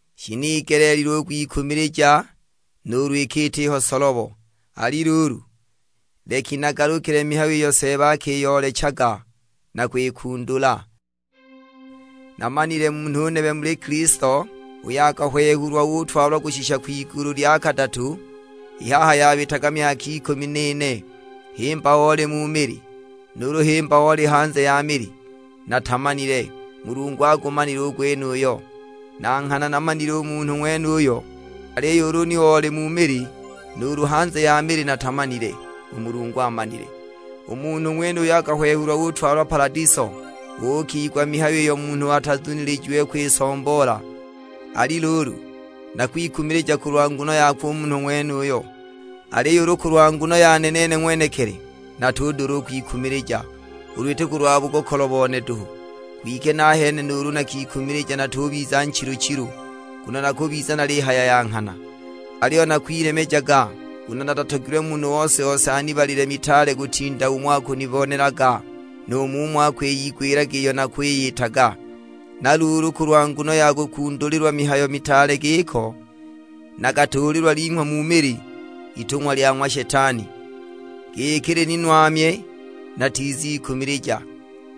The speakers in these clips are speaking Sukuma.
Shinigeleelilwe u kwikumilija nuulu iki itiho solobo; ali luulu, leki nagalukile mihayo iyo Seeba akiyoolechaga na kwikundula. Naamanile munhu nebe muli Kilisto, uyo akahwehulwa utwalwa kushisha kwigulu lya kadatu. I haha yabitaga myaka ikumi n'ine, himba oli mu mili, nuulu himba oli hanze ya mili, natamanile; Mulungu agumanile u gwenuyo. Na nghana naamanile u munhu ng'wenuyo, aliyo ulu oli mu mili nuulu hanze ya mili natamanile; u Mulungu amanile. U munhu ng'wenuyo akahwehulwa utwalwa paladiso, uukigwa mihayo iyo munhu atazunilijiwe kwisomboola. Ali luulu, nakwikumilija kulwa nguno yakwe u munhu ng'wenuyo, aliyo ulu kulwa nguno yane nene ng'wenekili, natudula u kwikumilija; ulu iti kulwa bugokolo bone duhu. Kwike nahene nuulu nakikumilija natubiza nchilu-chilu, nguno nakubiza nalihaya ya nghana. Aliyo nakwilemejaga, nguno natatogilwe munhu ose-ose anibalile mitaale kutinda umo akunibonelaga, nu mumo akwiyigwilaga iyo nakwiyitaga. Na luulu kulwa nguno ya kukundulilwa mihayo mitaale giko, nakatuulilwa linghwa mu mili, itung'wa lya ng'wa Shetani, giki lininwamye, natizikumilija.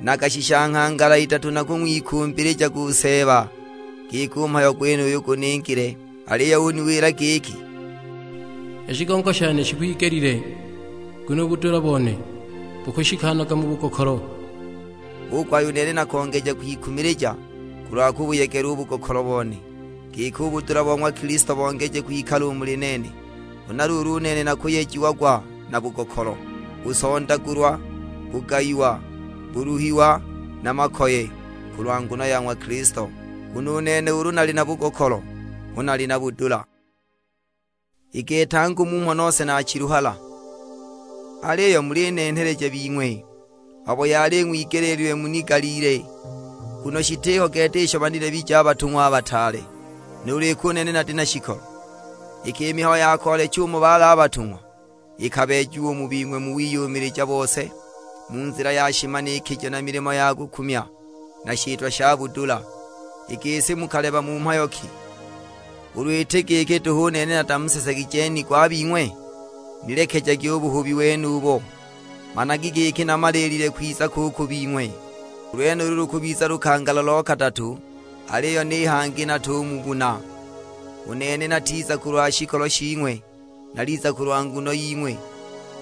Nakashisha nghangala idatu nakung'wikumbilijaga u Seeba, giki u mhayo gwenuyo guningile. Aliyo uniwila giki, "I shigongo shane shikwigelile, nguno u budula bone bukashikanaga mu bugokolo!" Hu kuhaya u nene nakongeja kwikumilija kulwa kubuyegela u bugokolo bone, giki u budula bo ng'wa Kilisto bongeje kwikala u muli nene. Huna luulu u nene nakuyejiagwa na bugokolo, busondagulwa, bugayiwa, buluhiwa, na makoye, kulwa nguno ya ng'wa Kilisto; nguno u nene ulu nali na bugokolo, hu nali na budula. I gete angu mmho nose naachiluhala! Aliyo mulinenheleja bing'we, abo yali ing'wigeleelilwe munigaliile. Nguno shitiho gete isho banilebije a batung'wa a bataale, nuulu iki u nene nati shikolo. Iki i mihayo ya koolecha umo bali a batung'wa ikabeejiwa u mu bing'we mu wiyumilija bose, mu nzila ya shimanikijo na milimo ya kukumya, na shitwa sha budula. I gisi mukaleba mu mhayo ki u kulenganila ni kanisa i jingi, ulu iti giki duhu u nene natamusesegije nigo a bing'we? Nilekejagi u buhubi wenubo. Managi giki namaliilile kwiza ko u ku bing'we. U lwenulu lukubiza lukangala lo kadatu, aliyo ni hangi natumubuna; u nene natizaga kulwa shikolo shing'we, naliza kulwa nguno ying'we.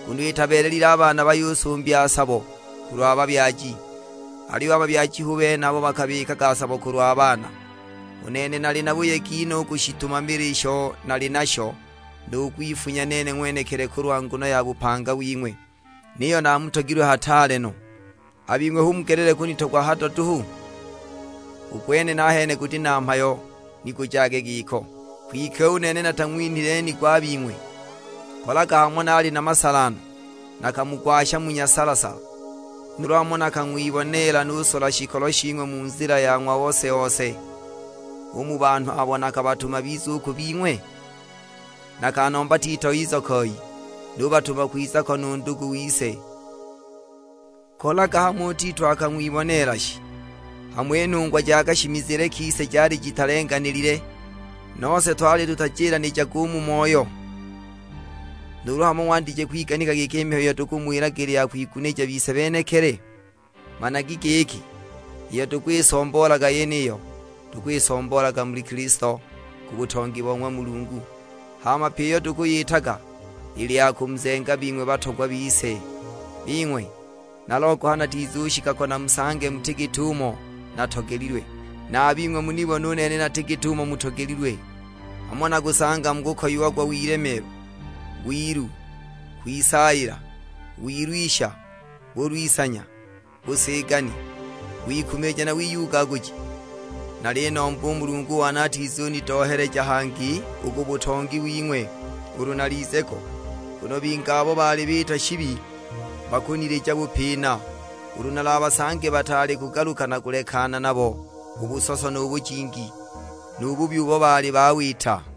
Nguno itabeelelile a baana bayusumbya sabo kulwa babyaji, aliyo a babyaji hu bene abo bakabikaga sabo kulwa baana. U nene nali na buyegi no u kushitumamila isho nali nasho, nu kwifunya nene ng'wenekili kulwa nguno ya bupanga wing'we. Niyo namutogilwe hataale no, a bing'we hu mugelele kunitogwa hado duhu? U gwene nahene guti na mhayo ni gujage giko. Kwike u nene natang'winhile nigo a bing'we. Kolaga hamo naali na masala no, nakamugwasha mu nyasala-sala! Nuulu hamo nakang'wiboneela nusola shikolo shing'we mu nzila ya ng'wa ose-ose u mu banhu abo nakabatuma bize u ku bing'we? Nakanomba Tito ize koi, nubatuma kwiza ko nu ndugu wise; kolaga hamo u Tito akang'wiboneela shi? Hamo i nhungwa ja kashimizile kise jali jitalenganilile, nose twali tutajilanijaga u mu moyo? Nuulu hamo ng'wandije kwiganika giki i mihayo iyo tukumuwilaga ili ya kwigunija bise benekili? Managi giki iyo tukwisomboolaga yeniyo, tukwisomboolaga muli Kilisto, ku butongi bo ng'wa Mulungu; hama pyi iyo tukuyitaga ili ya kumuzenga bing'we batogwa bise! Bing'we, nalogoha natizushika ko namusange muti git'umo natogelilwe, na a bing'we munibone u nene nati git'umo mutogelilwe. Hamo nakusanga mukukoyiagwa wilemeelwa, wilu, kwisaayila, wilwisha, bulwisanya, busigani, wikumilija na wiyugaguji. Nalinomba u Mulungu one atizunidoheleja hangi u ku butongi wing'we, ulu nalize ko! Nguno bingi abo baali biita shibi bakunilija bupina, ulu nalabasange bataali kugaluka na kulekana nabo u busoso nu bujingi, nu bubi ubo baali bawita!